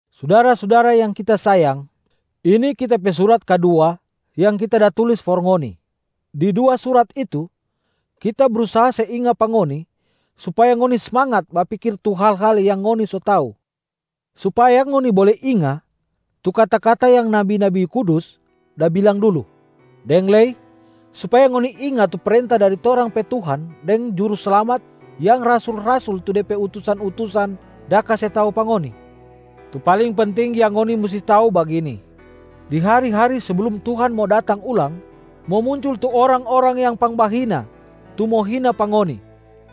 Sudara-sudara yang kita sayang, ini kita pe surat kadua yang kita da tulis for ngoni. Di dua surat itu, kita brusaha se inga pa ngoni supaya ngoni smangat bapikir tu hal-hal yang ngoni so tau, supaya ngoni bole inga tu kata-kata yang nabi-nabi kudus da bilang dulu, deng lei supaya ngoni inga tu prenta dari torang pe Tuhan deng Juruslamat yang rasul-rasul tu Dia pe utusan-utusan da kase tau pa ngoni. Tu paling penting yang ngoni musti tau bagini: di hari-hari seblum Tuhan mo datang ulang, mo muncul tu orang-orang yang pangbahina tu mo hina pa ngoni,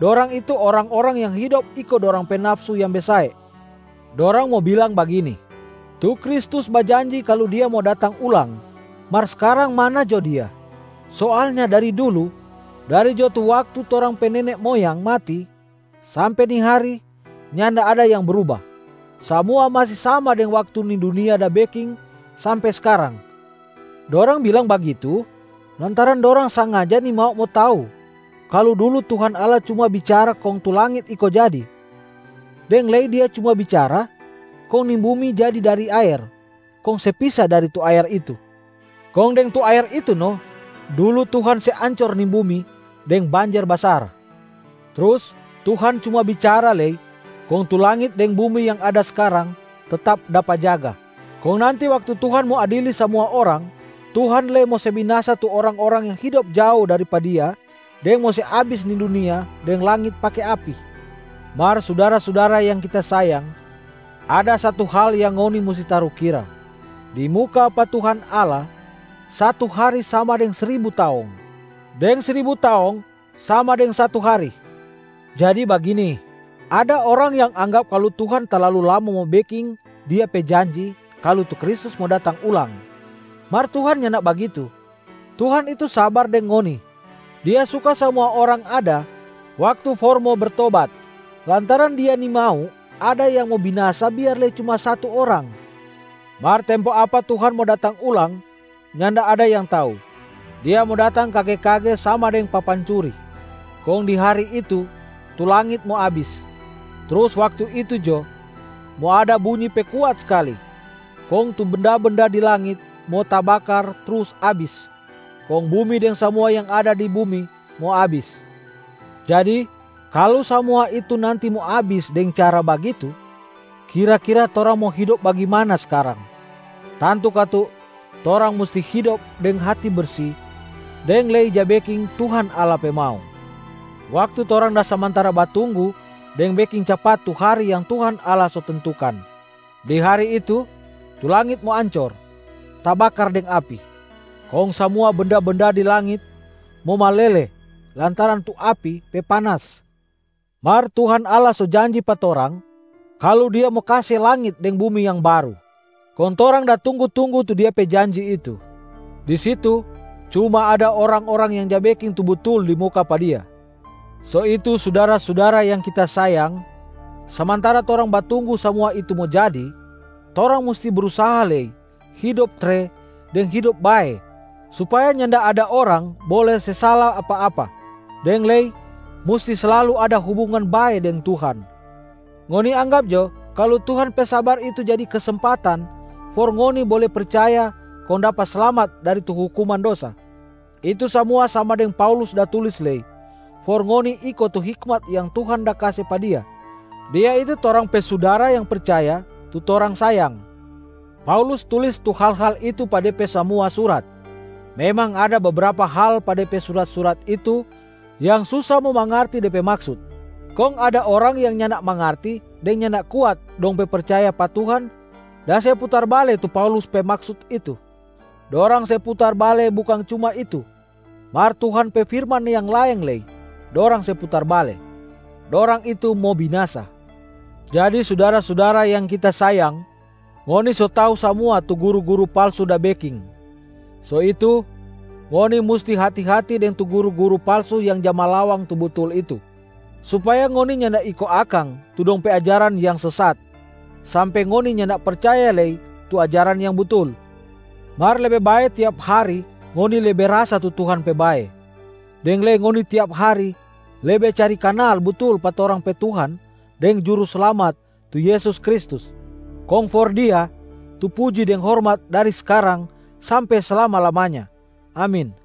dorang itu orang-orang yang hidop iko dorang pe nafsu yang besae. Dorang mo bilang bagini, “Tu Kristus bajanji kalu Dia mo datang ulang, mar skarang mana jo Dia? Soalnya dari dulu, dari jo tu waktu torang pe nene moyang mati sampe ni hari nyanda ada yang bruba, samua masi sama dari waktu ni dunia da beking sampe skarang.” Dorang bilang bagitu lantaran dorang sengaja nimau mo tau kalu dulu Tuhan Allah cuma bicara kong tu langit iko jadi, deng lei Dia cuma bicara, kong ni bumi jadi dari aer kong se pisa dari tu aer itu. Kong deng tu aer itu no dulu Tuhan se ancor ni bumi deng banjer basar. Trus Tuhan cuma bicara lei kong tu langit deng bumi yang ada skarang tetap dapa jaga, kong nanti waktu Tuhan mo adili samua orang, Tuhan lei mo se binasa tu orang-orang yang hidop jao dari pa Dia deng mo se abis ni dunia deng langit pake api. Mar sudara-sudara yang kita sayang, ada satu hal yang ngoni musti tarukira: di muka pa Tuhan Allah, satu hari sama deng sribu taong, deng sribu taong sama deng satu hari. Jadi bagini: ada orang yang anggap kalu Tuhan talalu lama mo beking Dia pe janji kalu tu Kristus mo datang ulang, mar Tuhan nyanda bagitu. Tuhan itu sabar deng ngoni, Dia suka samua orang ada waktu for mo bertobat, lantaran Dia nimau ada yang mo binasa biar lei cuma satu orang. Mar tempo apa Tuhan mo datang ulang nyanda ada yang tau, Dia mo datang kage-kage sama deng papancuri. Kong di hari itu tu langit mo abis, trus waktu itu jo mo ada bunyi pe kuat skali kong tu benda-benda di langit mo tabakar trus abis, kong bumi deng samua yang ada di bumi mo abis. Jadi kalu samua itu nanti mo abis deng cara bagitu, kira-kira torang mo hidop bagimana skarang? Tantu katu torang musti hidop deng hati bersi deng lei ja beking Tuhan Allah pe mau, waktu torang da samantara batunggu deng beking capat tu hari yang Tuhan Allah so tentukan. Di hari itu, tu langit mo ancor tabakar deng api, kong samua benda-benda di langit mo malele lantaran tu api pe panas. Mar Tuhan Allah so janji pa torang kalu Dia mo kase langit deng bumi yang baru, kong torang da tunggu-tunggu tu Dia pe janji itu. Di situ cuma ada orang-orang yang ja beking tu butul di muka pa Dia. So itu sudara-sudara yang kita sayang, samantara torang batunggu samua itu mo jadi, torang musti brusaha lei hidop tre deng hidop bae supaya nyanda ada orang bole se sala apa-apa, deng lei musti slalu ada hubungan bae deng Tuhan. Ngoni anggap jo kalu Tuhan pe sabar itu jadi kesempatan for ngoni bole percaya kong dapa slamat dari tu hukuman dosa. Itu samua sama deng Paulus da tulis lei for ngoni iko tu hikmat yang Tuhan da kase pa dia. Dia itu torang pe sudara yang percaya tu torang sayang. Paulus tulis tu hal-hal itu pa de pe samua surat. Memang ada bebrapa hal pa de pe surat-surat itu yang susa mo mangarti de pe maksut. Kong ada orang yang nyanda mangarti deng nyanda kuat dong pe percaya pa Tuhan da se putar bale tu Paulus pe maksut itu. Dorang se putar bale bukang cuma itu mar Tuhan pe firman yang laeng lei dorang se putar bale. Dorang itu mo binasa. Jadi sudara-sudara yang kita sayang, ngoni so tau samua tu guru-guru palsu da beking. So itu, ngoni musti hati-hati deng tu guru-guru palsu yang ja malawang tu butul itu, supaya ngoni nyanda iko akang tu dong pe ajaran yang sesat sampe ngoni nyanda percaya lei tu ajaran yang butul. Mar lebe bae tiap hari ngoni lebe rasa tu Tuhan pe bae, deng lei ngoni tiap hari lebe cari kanal butul pa torang pe Tuhan deng Juruslamat tu Yesus Kristus. Kong for Dia tu puji deng hormat dari skarang sampe slama-lamanya. Amin.